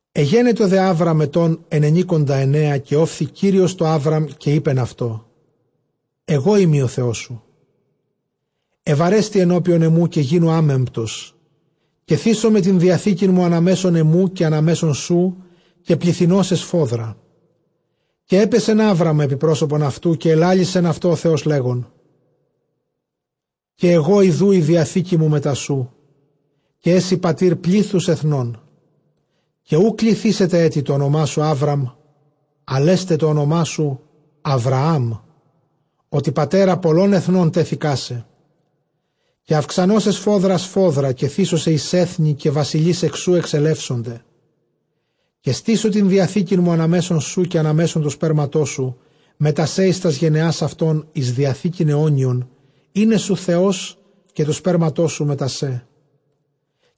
Ἐγένετο δὲ Ἅβραμ ἐτῶν ἐννενηκονταεννέα. Καὶ ὤφθη Κύριος τῷ Ἅβραμ, καὶ εἶπεν αὐτῷ, ἐγώ εἰμι ὁ Θεός σου· εὐαρέστει ἐνώπιον ἐμοῦ, καὶ γίνου ἄμεμπτος. Καὶ θήσομαι τὴν διαθήκην μου ἀνὰ μέσον ἐμοῦ, καὶ ἀνὰ μέσον σου, καὶ πληθυνῶ σε σφόδρα. Καὶ ἔπεσεν Ἅβραμ ἐπὶ πρόσωπον αὐτοῦ. Καὶ ἐλάλησεν αὐτῷ ὁ Θεὸς, λέγων, Καὶ ἐγὼ ἰδοὺ ἡ διαθήκη μου μετὰ σοῦ· καὶ ἔσῃ πατὴρ πλήθους ἐθνῶν. Καὶ οὐ κληθήσεται ἔτι τὸ ὄνομά σου Ἅβραμ, ἀλλʼ ἔσται τὸ ὄνομά σου Ἁβραὰμ, ὅτι πατέρα πολλῶν ἐθνῶν τέθεικά σε. Καὶ αὐξανῶ σε σφόδρα σφόδρα, καὶ θήσω σε εἰς ἔθνη· καὶ βασιλεῖς ἐκ σοῦ ἐξελεύσονται. Καὶ στήσω τὴν διαθήκην μου ἀνὰ μέσον σου, καὶ ἀνὰ μέσον τοῦ σπέρματός σου μετὰ σὲ εἰς τὰς γενεὰς αὐτῶν, εἰς διαθήκην αἰώνιον εἶναί σου Θεὸς, καὶ τοῦ σπέρματός σου μετὰ σέ.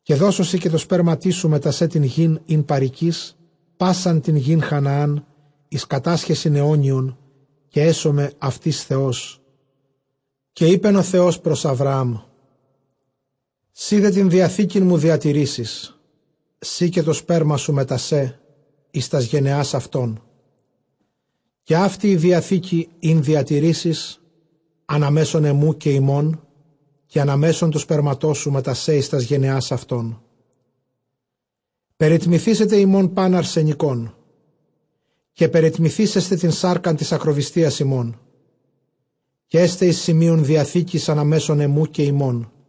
Καὶ δώσω σοι καὶ τῷ σπέρματί σου μετὰ σὲ τὴν γῆν, ἣν παροικεῖς, πᾶσαν τὴν γῆν Χαναὰν, εἰς κατάσχεσιν αἰώνιον· καὶ ἔσομαι αὐτοῖς εἰς Θεόν. Καὶ εἶπεν ὁ Θεὸς πρὸς Ἁβραὰμ, σὺ δὲ τὴν. διαθήκην μου διατηρήσεις, σὺ καὶ τὸ σπέρμα σου μετὰ σὲ εἰς τὰς γενεὰς αὐτῶν. Καὶ αὕτη ἡ διαθήκη, ἣν διατηρήσεις, ἀνὰ μέσον ἐμοῦ καὶ ὑμῶν, καὶ ἀνὰ μέσον τοῦ σπέρματός σου μετὰ σὲ εἰς τὰς γενεὰς αὐτῶν· περιτμηθήσεται ὑμῶν πᾶν ἀρσενικόν. Καὶ περιτμηθήσεσθε τὴν σάρκα τῆς ἀκροβυστίας ὑμῶν, καὶ ἔσται εἰς σημεῖον διαθήκης ἀνὰ μέσον ἐμοῦ καὶ ὑμῶν.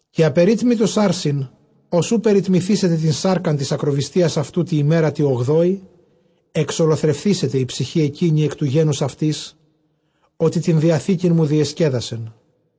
Καὶ ἀπερίτμητος ἄρσην, ὃς οὐ περιτμηθήσεται τὴν σάρκα τῆς ἀκροβυστίας αὐτοῦ τῇ ἡμέρᾳ τῇ ὀγδόῃ, ἐξολοθρευθήσεται ἡ ψυχὴ ἐκείνη ἐκ τοῦ γένους αὐτῆς, ὅτι τὴν διαθήκην μου διεσκέδασε.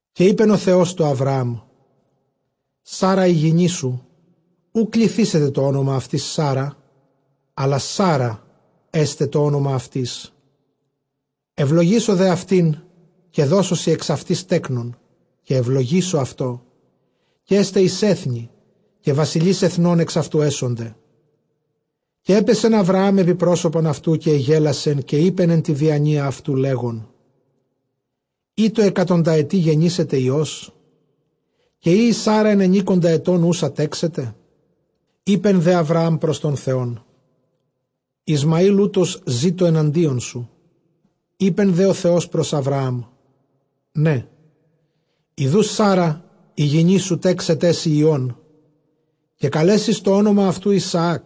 Καὶ εἶπεν ὁ Θεὸς τῷ Ἁβραὰμ, Σάρα ἡ γυνή σου, οὐ κληθήσεται τὸ ὄνομα αὐτῆς Σάρα, Σάῤῥα ἔσται τὸ ὄνομα αὐτῆς. Εὐλογήσω δὲ αὐτὴν, καὶ δώσω σοι ἐξ αὐτῆς τέκνον, καὶ εὐλογήσω αὐτὸ, καὶ ἔσται εἰς ἔθνη, καὶ βασιλεῖς ἐθνῶν ἐξ αὐτοῦ ἔσονται. Καὶ ἔπεσεν Ἁβραὰμ ἐπὶ πρόσωπον αὐτοῦ, καὶ ἐγέλασε· καὶ εἶπεν ἐν τῇ διανοίᾳ αὐτοῦ, λέγων, εἰ τῷ ἑκατονταετεῖ γενήσεται υἱός; καὶ εἰ ἡ Σάῤῥα ἐννενήκοντα ἐτῶν τέξεται; Εἶπε δὲ Ἁβραὰμ πρὸς τὸν Θεόν· Ἰσμαὴλ οὗτος ζήτω ἐναντίον σου. Εἶπε δὲ ὁ Θεὸς πρὸς Ἁβραὰμ, ναί· ἰδοὺ Σάῤῥα ἡ γυνή σου τέξεταί σοι υἱὸν, καὶ καλέσεις τὸ ὄνομα αὐτοῦ Ἰσαάκ·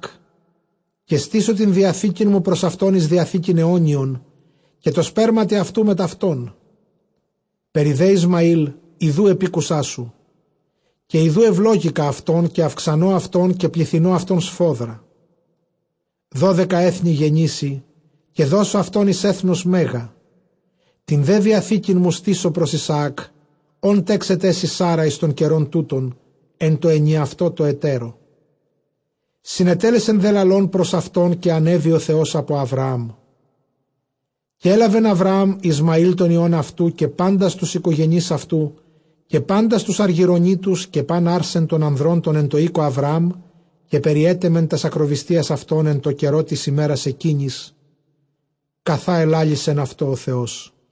καὶ στήσω τὴν διαθήκην μου πρὸς αὐτὸν, εἰς διαθήκην αἰώνιον, εἶναι αὐτῷ Θεὸς καὶ τῷ σπέρματι αὐτοῦ μετʼ αὐτόν. Περὶ δὲ Ἰσμαὴλ ἰδοὺ ἐπήκουσά σου· καὶ ἰδοὺ εὐλόγηκα αὐτὸν, καὶ αὐξανῶ αὐτὸν, καὶ πληθυνῶ αὐτὸν σφόδρα δώδεκα ἔθνη γεννήσει, καὶ δώσω αὐτὸν εἰς ἔθνος μέγα. Τὴν δὲ διαθήκην μου στήσω πρὸς Ἰσαὰκ, ὃν τέξεταί σοι Σάῤῥα εἰς τὸν καιρὸν τοῦτον, ἐν τῷ ἐνιαυτῷ τῷ ἑτέρῳ. Συνετέλεσε δὲ λαλῶν πρὸς αὐτὸν, καὶ ἀνέβη ὁ Θεὸς ἀπὸ Ἁβραάμ. Καὶ ἔλαβεν Ἁβραὰμ Ἰσμαὴλ τὸν υἱὸν ἑαυτοῦ, καὶ πάντας τοὺς οἰκογενεῖς αὐτοῦ, καὶ πάντας τοὺς ἀργυρωνήτους, καὶ πᾶν ἄρσεν τῶν ἀνδρῶν τῶν ἐν τῷ οἴκῳ Ἁβραὰμ, καὶ περιέτεμε τὰς ἀκροβυστίας αὐτῶν, ἐν τῷ καιρῷ τῆς ἡμέρας ἐκείνης, καθὰ ἐλάλησεν αὐτῷ ὁ Θεός.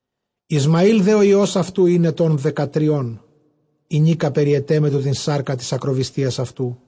Ἰσμαὴλ δὲ ὁ υἱὸς αὐτοῦ ἦν ἐτῶν δεκατριῶν, ἡνίκα περιετέμετο τὴν σάρκα τῆς ἀκροβυστίας αὐτοῦ.